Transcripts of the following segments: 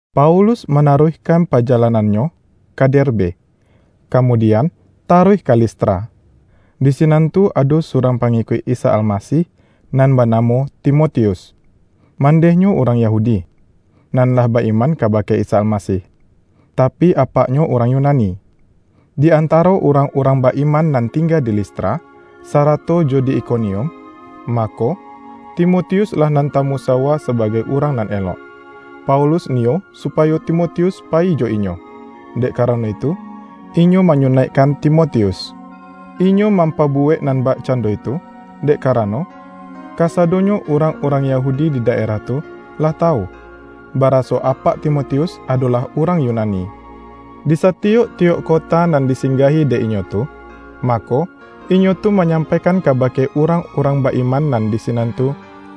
Paulus manaruihkan paja-lanannyo ka Derbe, kamudian taruih ka Listra. Di sinan tu ado surang pangikuik Isa Almasih nan banamo Timotius. Mandehnyo urang Yahudi, nan lah ba-iman kabake Isa Almasih; tapi apaknyo urang Yunani. Di antaro urang-urang ba-iman nan tingga di Listra, sarato jo di Ikonium, mako, Timotius-lah nan tamusawua sabagai urang nan elok. Paulus niyo supayo Timotius payi jo inyo; dek karano itu, inyo manyunaikkan Timotius. Inyo mampabuwek nan bakcando itu, dek karano, kasadonyo urang-urang Yahudi di daerah tu lah tawu, baraso apak Timotius adolah urang Yunani. Disatiyok-tiyok kota nan disinggahi dek inyo tu, mako, inyo tu manyampaikan kabake urang-urang ba-iman nan di sinan tu,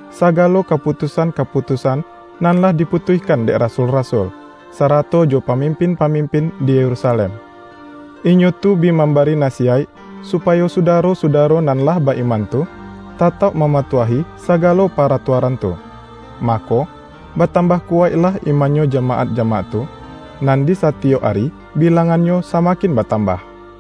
sagalo kaputusan-kaputusan nan lah diputuihkan dek rasul-rasul, sarato jo pamimpin-pamimpin di Yerusalem. Inyo tu bi mambari nasiyaik supayo sudaro-sudaro nan lah ba-iman tu, tatauk mamatuahi sagalo paratuaran tu. Mako, batambah kuwaiklah imannyo jamaat-jamaat tu, nan di satiyok ari bilangannyo samakin batambah.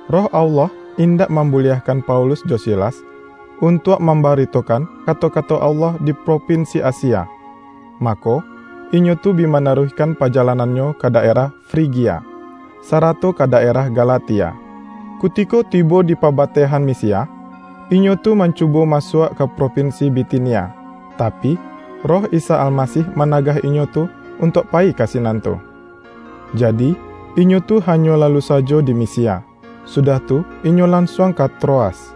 Roh Allah indak mambuliahkan Paulus jo Silas, untuak mambaritokan kato-kato Allah di propinsi Asia. Mako, inyo tu bi manaruihkan pajalanannyo ka daerah Frigia, sarato ka daerah Galatia. Kutiko tibo di pabatehan Misia, inyo tu mancubo masuak ka propinsi Bitinia, tapi, Roh Isa Almasih managah inyo tu untuak payi ka sinan tu. Jadi, inyo tu hanyo lalu sajo di Misia, sudah tu inyo lansuang ka Troas.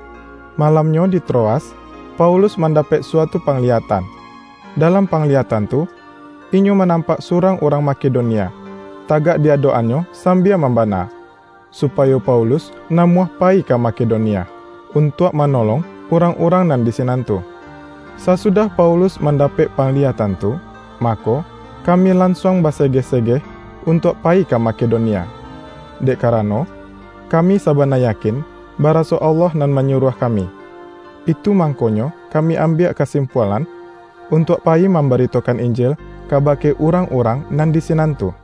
Malamnyo, di Troas, Paulus mandapek suatu pangliyatan. Dalam pangliyatan tu, inyo manampak surang urang Makedonia, tagak di adok-annyo sambia mambana, supayo Paulus namuah payi ka Makedonia, untuak manolong urang-urang nan di sinan tu. Sasudah Paulus ma-ndapek pangliyatan tu, mako, kami lansuang basegeh-segeh untuak payi ka Makedonia. Dek karano, kami sabana yakin baraso Allah nan manyuruah kami, itu mangkonyo kami ambiak kasimpualan untuak payi mambaritokan Injil kabake urang-urang nan di sinan tu.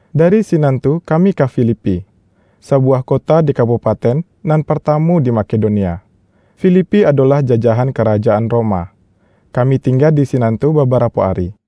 Dari sinan tu kami ka Filipi, sabuwah kota di kabupaten nan partamu di Makedonia. Filipi adolah jajahan karajaan Roma. Kami tingga di sinan tu babarapo ari.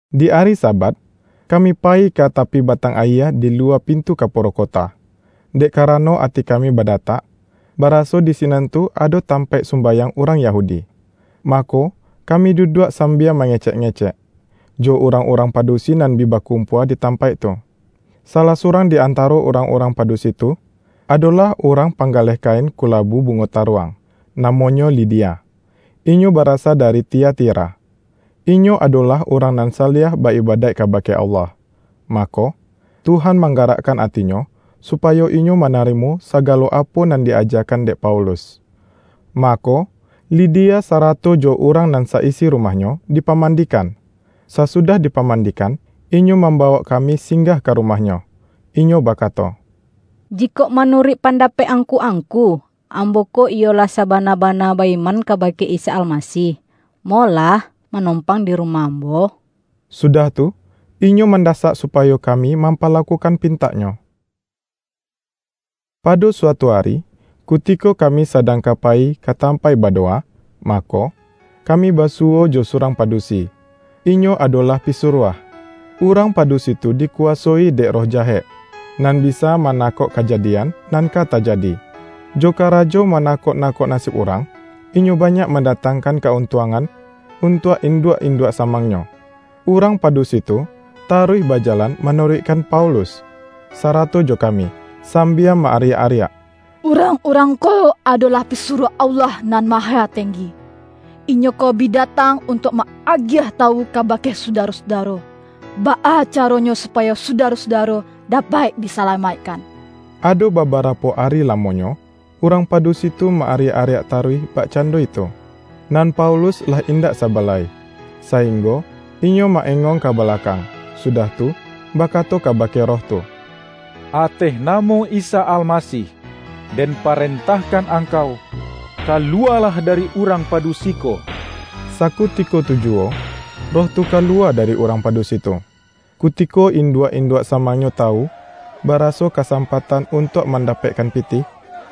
Di ari Sabat, kami payi ka tapi batang ayie di luwa pintu kaporo kota, dek karano ati kami badatak, baraso di sinan tu ado tampaik sumbayang urang Yahudi. Mako, kami duduak sambia mangecek-ngecek, jo urang-urang padusi nan bi bakumpua di tampaik tu. Salah surang di antaro urang-urang padusi tu, adolah urang panggaleh kain kulabu bungo taruang, namonyo Lidia, inyo barasa dari Tiatira. Inyo adolah urang nan saliah ba-ibadaik kabake Allah, mako, Tuhan manggarakkan atinyo, supayo inyo manarimo sagalo apo nan di-ajakan dek Paulus. Mako, Lidia sarato jo urang nan sa-isi rumahnyo dipamandikan. Sasudah dipamandikan, inyo mambawok kami singgah ka rumahnyo. Inyo bakato,”Jikok manuruik pandapek angku-angku, ambo ko iyo lah sabana-bana ba-iman kabake Isa Almasih, molah manompang di rumah ambo.” Sudah tu, inyo mandasak supayo kami mampalakukan pintaknyo. Pado suatu ari, kutiko kami sadang ka payi ka tampaik badowa, mako, kami basuwo jo surang padusi; inyo adolah pisuruah. Urang padusi tu dikuwasoi dek roh jahek, nan bisa manakok kajadian, nan ka tajadi. Jo karajo manakok-nakok nasib urang, inyo banyak mandatangkan ka-untuangan untuak induak-induak samangnyo. Urang padusi tu taruih bajalan manuruikkan Paulus, sarato jo kami, sambia ma-ariak-ariak,”Urang-urang ko adolah pisuruah Allah Nan Mahatenggi! Inyo ko bi datang untuak ma-agiah tawu kabake Sudaro-sudaro, baa caranyo supayo Sudaro-sudaro dapek disalamaikkan!” Ado babarapo ari lamonyo, urang padusi tu ma-ariak-ariak taruih bakcando itu. Nan Paulus lah indak saba lai, sainggo inyo ma-engong ka balakang, sudah tu, bakato kabake roh tu”Ateh namo Isa Almasih, den parentahkan angkau, kaluwalah dari urang padusi ko!” Sakutiko tu juwo, roh tu kaluwa dari urang padusi tu. Kutiko induak-induak samangnyo tawu, baraso kasampatan untuak mandapekkan pitih,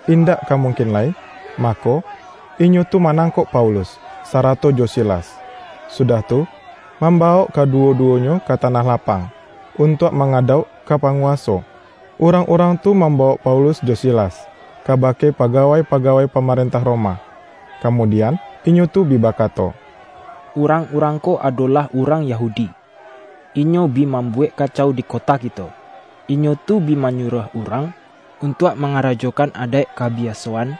indak ka mungkin lai, mako, inyo tu manangkok Paulus, sarato jo Silas, sudah tu, mambawok kaduwo-duwonyo ka tanah lapang, untuak mangadauk ka panguwaso. Urangurang tu mambawok Paulus jo Silas, kabake pagawai-pagawai pamarentah Roma, kamudian inyo tu bi bakato,”Urang-urang ko adolah urang Yahudi. Inyo bi mambuwek kacau di kota kito. Inyo tu bi manyuruah urang untuak mangarajokan adaik kabiasoan,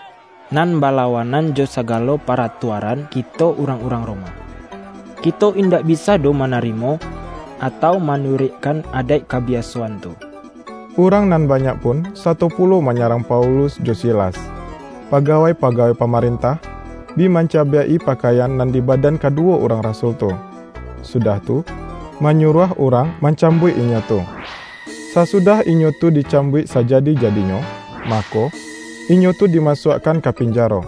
nan balawanan jo sagalo paratuaran kito urang-urang Roma. Kito indak bisa doh manarimo, atau manuruikkan adaik kabiasoan tu!” Urang nan banyak pun sato pulo manyarang Paulus jo Silas; pagawai-pagawai pamarentah, bi mancabiak-i pakaian nan di badan kaduwo urang rasul tu, sudah tu, manyuruah urang mancambuik inyo tu. Sasudah inyo tu dicambuik sajadi-jadinyo, mako, inyo tu dimasuakkan ka pinjaro.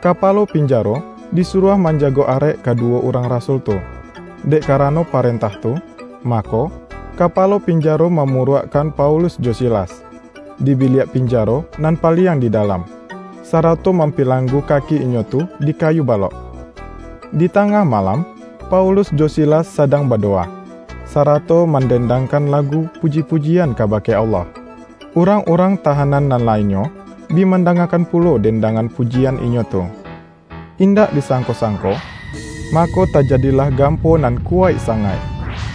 Kapalo pinjaro disuruah manjago arek kaduwo urang rasul tu. Dek karano parentah tu, mako, kapalo pinjaro mamuruakkan Paulus jo Silas, di biliak pinjaro nan paliang di dalam, sarato mampilanggu kaki inyo tu di kayu balok. Di tangah malam, Paulus jo Silas sadang badowa, sarato man-dendangkan lagu puji-pujian kabake Allah. Urang-urang tahanan nan lainnyo, bi mandangakan pulo den-dangan pujian inyo tu. Indak disangko-sangko, mako tajadilah gampo nan kuwaik sangaik,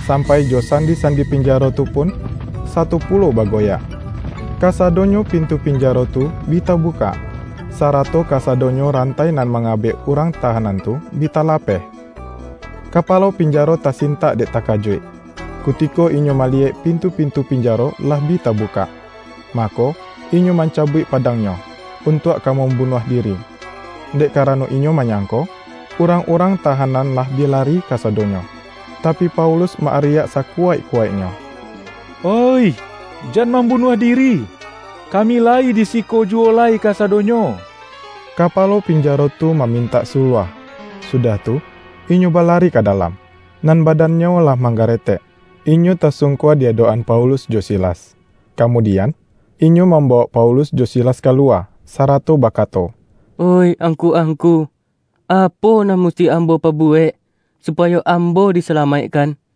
sampai jo sandi-sandi pinjaro tu pun sato pulo bagoyak. Kasadonyo pintu pinjaro tu bi tabukak, sarato kasadonyo rantai nan mangabek urang tahanan tu, bi talapeh. Kapalo pinjaro tasintak dek takajuik. Kutiko inyo maliyek pintu-pintu pinjaro lah bi tabukak, mako, inyo mancabuik padangnyo, untuak ka mambunuah diri, dek karano inyo manyangko, urang-urang tahanan lah bi lari kasadonyo. Tapi, Paulus ma-ariak sakuwaik-kuwaiknyo,”Oih, jan mambunuah diri! Kami layi di siko juwo lai kasadonyo!” Kapalo pinjaro tu mamintak suluah, sudah tu inyo balari ka dalam, nan badannyo lah manggaretek, inyo tasungkua di adok-an Paulus jo Silas. Kamudian, inyo mambawok Paulus jo Silas kaluwa, sarato bakato,”Oih angku-angku, apo nan musti ambo pabuwek, supayo ambo disalamaikkan?”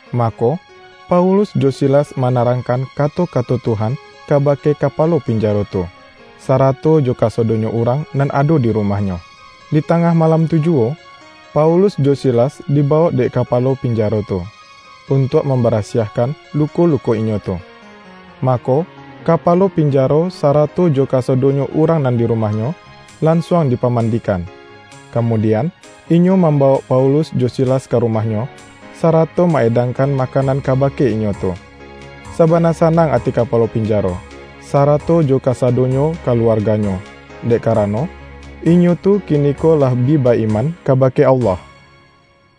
Mako, Paulus jo Silas manarangkan kato-kato Tuhan kabake kapalo pinjaro tu, sarato jo kasadonyo urang nan ado di rumahnyo. Di tangah malam tu juwo, Paulus jo Silas dibawok dek kapalo pinjaro tu, untuak mambarasiahkan luko-luko inyo tu. Mako, kapalo pinjaro, sarato jo kasadonyo urang nan di rumahnyo, lansuang dipamandikan. Kamudian, inyo mambawok Paulus jo Silas ka rumahnyo, sarato ma-edangkan makanan kabake inyo tu. Sabana sanang ati kapalo pinjaro, sarato jo kasadonyo kaluarganyo, dek karano, inyo tu kiniko lah bi ba-iman kabake Allah.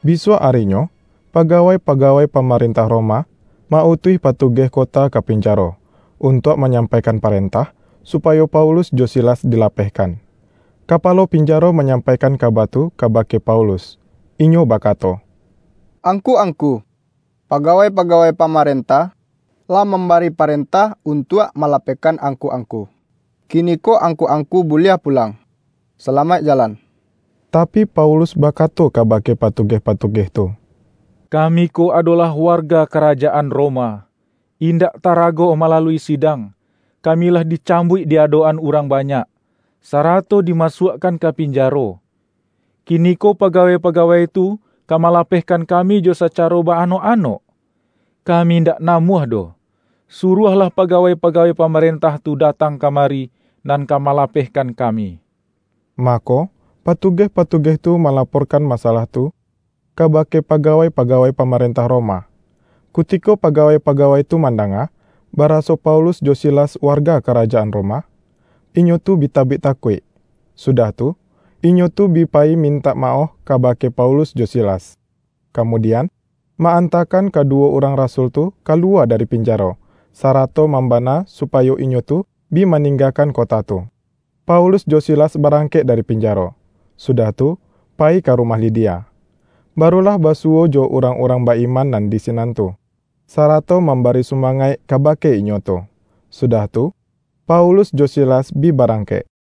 Bisuak arinyo, pagawai-pagawai pamarentah Roma ma-utuih patugeh kota ka pinjaro, untuak manyampaikan parentah supayo Paulus jo Silas dilapehkan. Kapalo pinjaro manyampaikan kaba tu kabake Paulus. Inyo bakato,”angku-angku, pagawai-pagawai pamarentah, lah mambari parentah untuak malapehkan angku-angku. Kiniko angku-angku buliah pulang. Salamaik jalan!” Tapi, Paulus bakato kabake patugeh-patugeh tu,”Kami ko adolah warga karajaan Roma. Indak tarago malalui sidang, kami lah dicambuik di adok-an urang banyak, sarato dimasuakkan ka pinjaro. Kiniko pagawai-pagawai tu ka malapehkan kami jo sacaro ba-anok-anok? Kami indak namuah doh! Suruahlah pagawai-pagawai pamarentah tu datang kamari, nan ka malapehkan kami.” Mako, patugeh-patugeh tu malaporkan masalah tu kabake pagawai-pagawai pamarentah Roma. Kutiko pagawai-pagawai tu mandanga, baraso Paulus jo Silas warga karajaan Roma, inyo tu bi tabik takuik. Sudah tu, inyo tu bi payi mintak maoh kabake Paulus jo Silas, kamudian, ma-antakan kaduwo urang rasul tu kaluwa dari pinjaro, sarato mambana supayo inyo tu bi maninggakan kota tu. Paulus jo Silas barangkek dari pinjaro, sudah tu, payi ka rumah Lidia. Baru lah basuwo jo urang-urang ba-iman nan di sinan tu, sarato mambari sumangaik kabake inyo tu, sudah tu, Paulus jo Silas bi barangkek. RIWAYAIK RASUL-RASUL